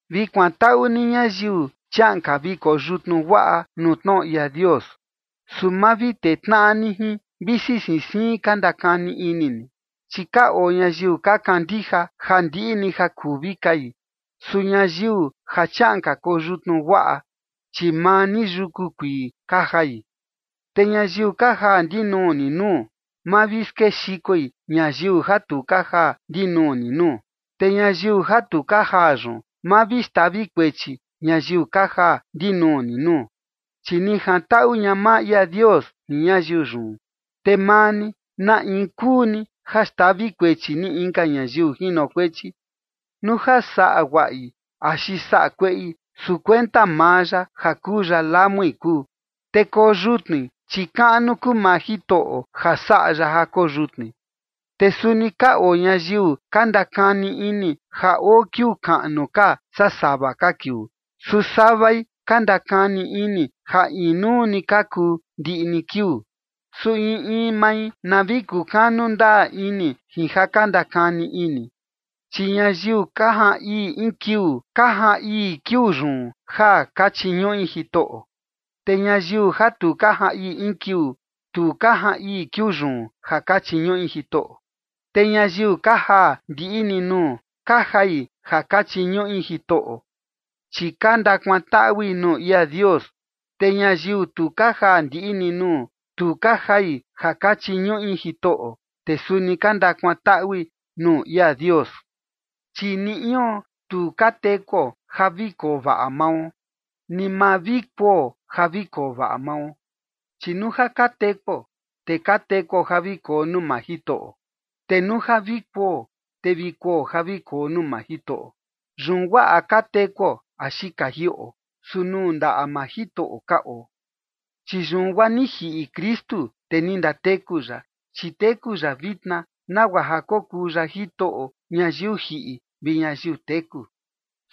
Vi kuantaꞌu ni ñayiu chiaꞌan ka vi koyutnu guaꞌa nuu tnoꞌo ia Dios, su ma vi tee tnaꞌa ni jin visi siin siin ka ndakani ini ni. Chi ka oo ñayiu ka kandija ja ndiꞌi ni ja kuu vi kai. Su ñayiu ja chiaꞌan ka koyutnu guaꞌa, chi maa ni yuku kuii ka jai. Te ñayiu ka jaa ndinuu ni nuu, ma vi skexikoi ñayiu ja tu ka jaa ndinuu ni nuu. Te ñayiu ja tu ka jaa yun, ma vi xtavi kuechi ñayiu ka jaa ndinuu ni nuu, chi ni jantaꞌu ña maa ia Dios jin ñayiu yun. Te maa ni, ¿na in kuu ni ja xtavi kuechi ni inka ñayiu jinokuechi? Nuu ja saꞌa guaꞌi axi saꞌa kueꞌi, su kuenta maa ya ja kuu ya lamui kuu, te koo yutnui, chi kaꞌnu kuu maa Jitoꞌo ja saꞌa ya ja koo yutnui. Te suni ka oo ñayiu ka ndakani ini ja oo kiuu kaꞌnu ka saa sava ka kiuu, su savai ka ndakani ini ja inuu ni ka kuu ndiꞌi ni kiuu. Su in in mai na vi kukanu ndaa ini jin ja ka ndakani ini. Chi ñayiu ka jaan ii in kiuu, ka jaan ii kiuu yun ja ka chiñuꞌi Jitoꞌo. Te ñayiu ja tu ka jaan ii in kiuu, tu ka jaan ii kiuu yun ja ka chiñuꞌi Jitoꞌo. Te ñayiu ka jaa ndiꞌi ni nuu, ka jai ja ka chiñuꞌi Jitoꞌo, chi ka ndakuantaꞌui nuu ia Dios. Te ñayiu tu ka jaa ndiꞌi ni nuu, tu ka jai ja ka chiñuꞌi Jitoꞌo, te suni ka ndakuantaꞌui nuu ia Dios. Chi ni ion tu ka tekuo ja vi koo vaꞌa mao, ni ma vi kuo ja vi koo vaꞌa mao. Chi nuu ja ka tekuo, te ka tekuo ja vi koo nuu maa Jitoꞌo. Te nuu ja vi kuo te vi kuo ja vi koo nuu maa Jitoꞌo. Yun guaa a ka tekuo axi ka jiꞌo, su nuu ndaꞌa maa Jitoꞌo ka oo. Chi yun guaa ni jiꞌi Kristu, te ni ndateku ya, chi teku ya vitna nagua ja kokuu ya Jitoꞌo ñayiu jiꞌi vi ñayiu teku.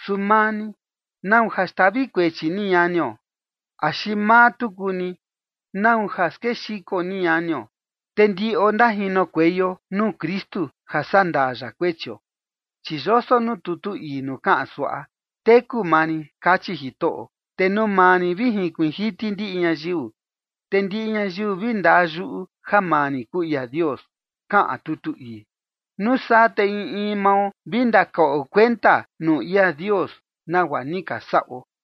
Su maa ni, ¿nau ja xtavi kuechi ni ñanio? Axi maa tuku ni, ¿nau ja skexiko ni ñanio? Te ndiꞌo ndajinokueio nuu Kristu ja sandaa ya kuechio. Chi yoso nuu tutu ii nuu kaꞌan suaꞌa: Teku maa rin, kachi Jitoꞌo, te nuu maa rin vi jinkuiin jiti ndiꞌi ñayiu, te ndiꞌi ñayiu vi ndaa yuꞌu ja maa rin kuu ia Dios, kaꞌan tutu ii. Nuu saa, te in in mao vi ndakuaꞌo kuenta nuu ia Dios nagua ni ka saꞌo.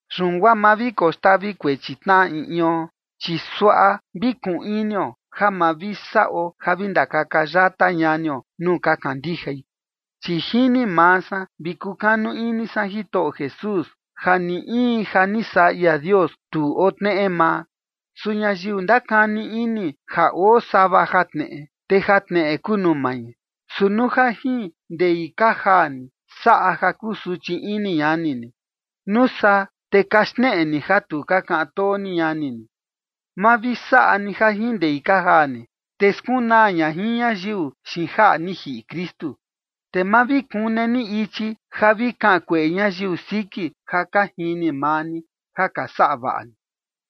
Yun guaa ma vi koxtavi kuechi tnaꞌa in ion, chi suaꞌa vi kuꞌun inio ja ma vi saꞌo ja vi ndakaka yata ñanio nuu ka kandijai. Chi jini maa san vi kukanu ini san Jitoꞌo Jesús, ja ni in ja ni saꞌa ia Dios tu oo tneꞌe maa, su ñayiu ndakani ini ja oo sava jatneꞌe, te jatneꞌe kuu nuu mai. Su nuu ja jin ndei ka jaa ni, saꞌa ja kusuchi ini ñani ni, nuu saa te ka xneꞌe ni ja tu ka kaꞌan too ni ñani ni. Ma vi saꞌa ni ja jin ndei ka jaa ni, te skunaa ña jin ñayiu xiin jaꞌa ni jiꞌi Kristu. Te ma vi kune ni ichi ja vi kaꞌan kueꞌe ñayiu siki ja ka jini maa ni ja ka saꞌa vaꞌa ni.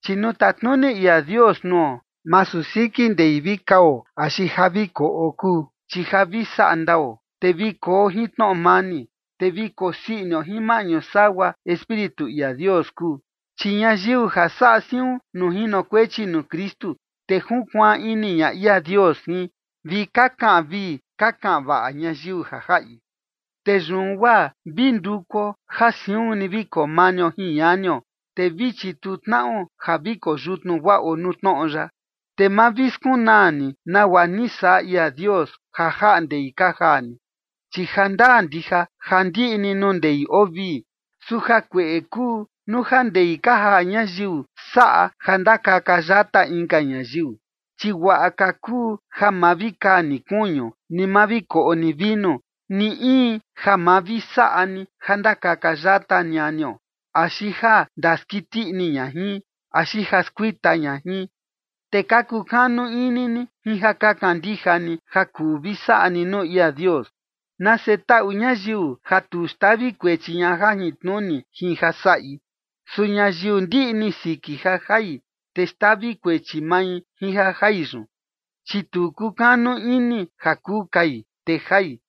Chi nuu tatnuni ia Dios nuo, masu siki ndei vi kao axi ja vi koꞌo kuu, chi ja vi saꞌa ndao, te vi koo jin tnoꞌo mani, te vi kosii inio jin maꞌñu sagua Espíritu ia Dios kuu. Chi ñayiu ja saꞌa siun nuu jinokuechi nuu Kristu, te junkuaan ini ña ia Dios jin, vi ka kaꞌan vii ka kaꞌan vaꞌa ñayiu ja jaꞌi. Te yun guaa vi ndukuo ja siun ni vi koo manio jin ñanio, te vi chituu tnaꞌo ja vi koyutnu guaꞌo nuu tnoꞌo ya. Te ma vi skunaa ni nagua ni saꞌa ia Dios ja jaꞌa ndei ka jaa ni. Chi jandaa ndija ja ndiꞌi ni nuu ndei oo vii, su jakueꞌe kuu nuu ja ndei ka jaa ñayiu saꞌa ja ndakaka yata inka ñayiu. Chi guaꞌa ka kuu ja ma vi kaa ni kuñu, ni ma vi koꞌo ni vinu, ni in ja ma vi saꞌa ni ja ndakaka yata ñanio, axi ja ndaskiti ini ña jin, axi ja skuita ña jin. Te ka kukanu ini ni jin ja ka kandija ni ja kuu vi saꞌa ni nuu ia Dios. Nase taꞌu ñayiu ja tu xtavi kuechi ña jajintnuni jin ja saꞌi. Su ñayiu ndiꞌni siki ja jai, te xtavi kuechi mai jin ja jai yun, chi tu kukanu ini ja kuu kai, te jai.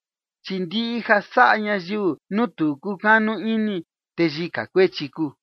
Chi ndiꞌi ja saꞌa ñayiu nuu tu kukanu ini, te yika kuechi kuu.